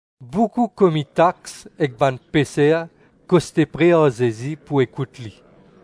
Boukou komi tax ek bann peser koste pre ar Zezi pou ekout li.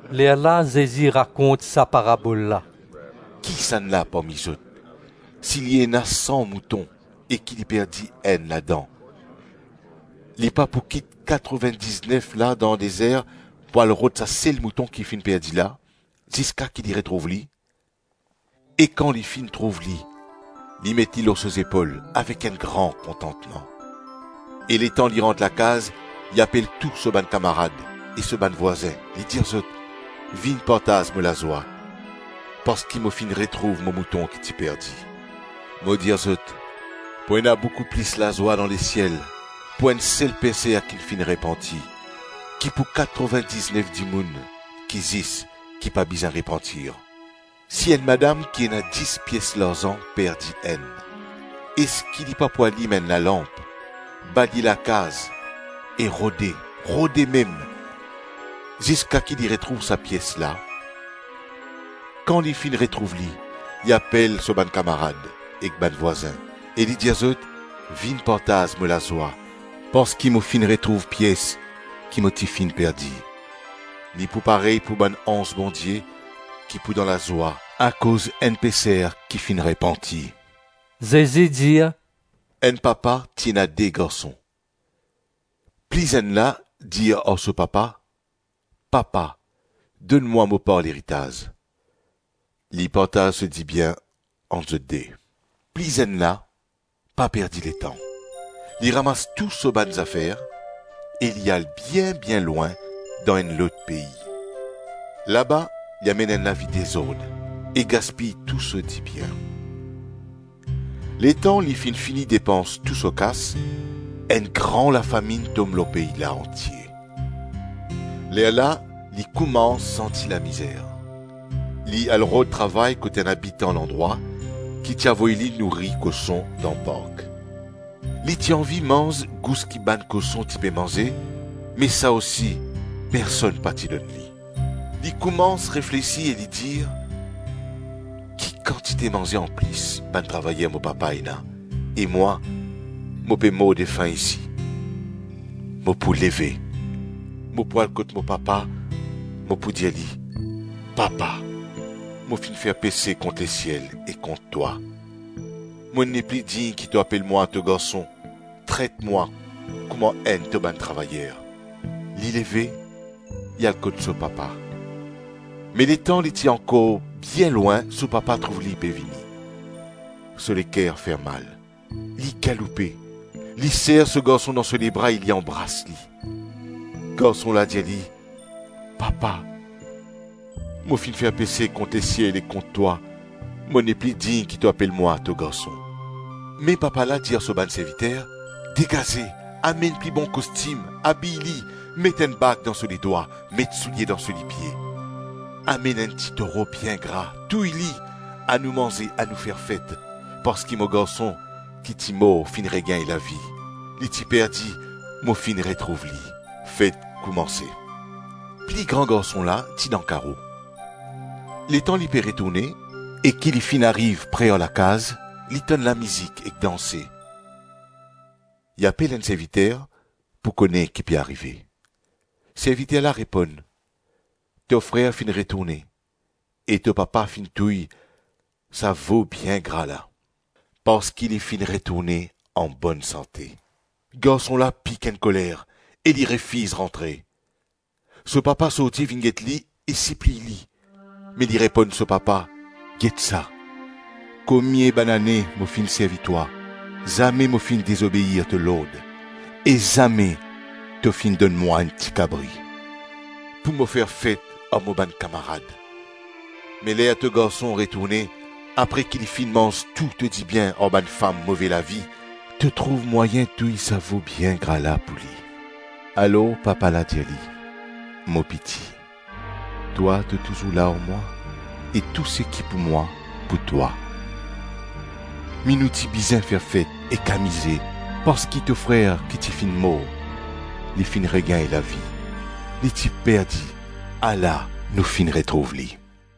Lerla Zezi rakont sa parabol la, “Kisannla parmi zot, si li ena san mouton, e ki li perdi enn ladan, li pa pou kit katrovin-diznef la dan dezer, pou al rod sa sel mouton ki finn perdi la, ziska ki li retrouv li? E kan li finn trouv li, li met li lor so zepol avek enn gran kontantman. E letan li rant lakaz li apel tou so bann kamarad e so bann vwazin, li dir zot, ‘Vinn partaz mo lazwa parski mo finn retrouv mo mouton ki ti perdi.’ Mo dir zot, pou ena boukou plis lazwa dan lesiel pou enn sel peser ki finn repanti, ki pou katrovin-diznef dimoun ki zis, ki pa bizin repantir.” “Si enn madam ki ena dis pies larzan perdi enn, eski li pa pou alim enn lalanp, balye lakaz e rode, rode mem, ziska ki li retrouv sa pies la? Kan li finn retrouv li, li apel so bann kamarad ek bann vwazin, e li dir zot, ‘Vinn partaz mo lazwa parski mo finn retrouv pies ki mo ti finn perdi.’ Li pou parey pou bann anz Bondie ki pou dan lazwa akoz enn peser ki finn repanti.” Zezi dir, “Enn papa ti ena de garson. Pli zenn la dir ar so papa, ‘Papa, donn mwa mo par leritaz.’ Li partaz so dibien ant zot de. Pli zenn la pa perdi letan. Li ramas tou so bann zafer e li al bien-bien lwin dan enn lot pei. Laba li amenn enn lavi dezord e gaspiy tou so dibien. Letan li finn fini depans tou so kas, enn gran lafaminn tom lor pei la antie. Lerla li koumans santi lamizer. Li al rod travay kot enn abitan landrwa, ki ti avoy li nouri koson dan park. Li ti anvi manz gous ki bann koson ti pe manze, me sa osi personn pa ti donn li. Li koumans reflesi e li dir, ‘Ki kantite manze anplis bann travayer mo papa ena, e mwa mo pe mordefin isi! Mo pou leve, mo pou al kot mo papa, mo pou dir li, ‘Papa, mo finn fer pese kont lesiel e kont twa; mo nepli dign ki to apel mwa to garson; tret mwa kouma enn to bann travayer.’ Li leve, li al kot so papa. Me letan li ti ankor bien lwin so papa trouv li pe vini. So leker fermal. Li galoupe, li ser so garson dan so lebra e li anbras li. Garson la dir li, ‘Papa, mo finn fer pese kont lesiel e kont twa; mo nepli dign ki to apel mwa to garson.’ Me papa la dir ar so bann serviter, ‘Degaze, amenn pli bon kostim, abiy li, met enn bag dan so ledwa, met soulie dan so lipie. Amenn enn ti toro bien gra, touy li; anou manze, anou fer fet, parski mo garson ki ti mor finn regagn lavi; li ti perdi, mo finn retrouv li.’ Fet koumanse. Pli gran garson la ti dan karo. Letan li pe retourne e ki li finn ariv pre ar lakaz, li tann lamizik ek danse. Li apel enn serviter pou kone ki pe arive. Serviter la reponn, ‘To frer finn retourne e to papa finn touy sa vo bien gra la, parski li finn retourne anbonn sante.’ Garson la pik enn koler e li refiz rantre. So papa sorti vinn get li, e sipliy li, me li reponn so papa, ‘Get sa, komie banane mo finn servi twa, zame mo finn dezobeir to lord; e zame to finn donn mwa enn tikabri pou mo fer fet ar mo bann kamarad. Me ler to garson retourne, apre ki li finn manz tou to dibien ar bann fam move lavi, to trouv mwayin touy sa vo bien gra la pou li.’ Alor papa la dir li, ‘Mo piti, twa, to touzour la ar mwa, e tou seki pou mwa, pou twa; me nou ti bizin fer fet ek amize, parski to frer ki ti finn mor, li finn regagn lavi; li ti perdi, ala nou finn retrouv li.’”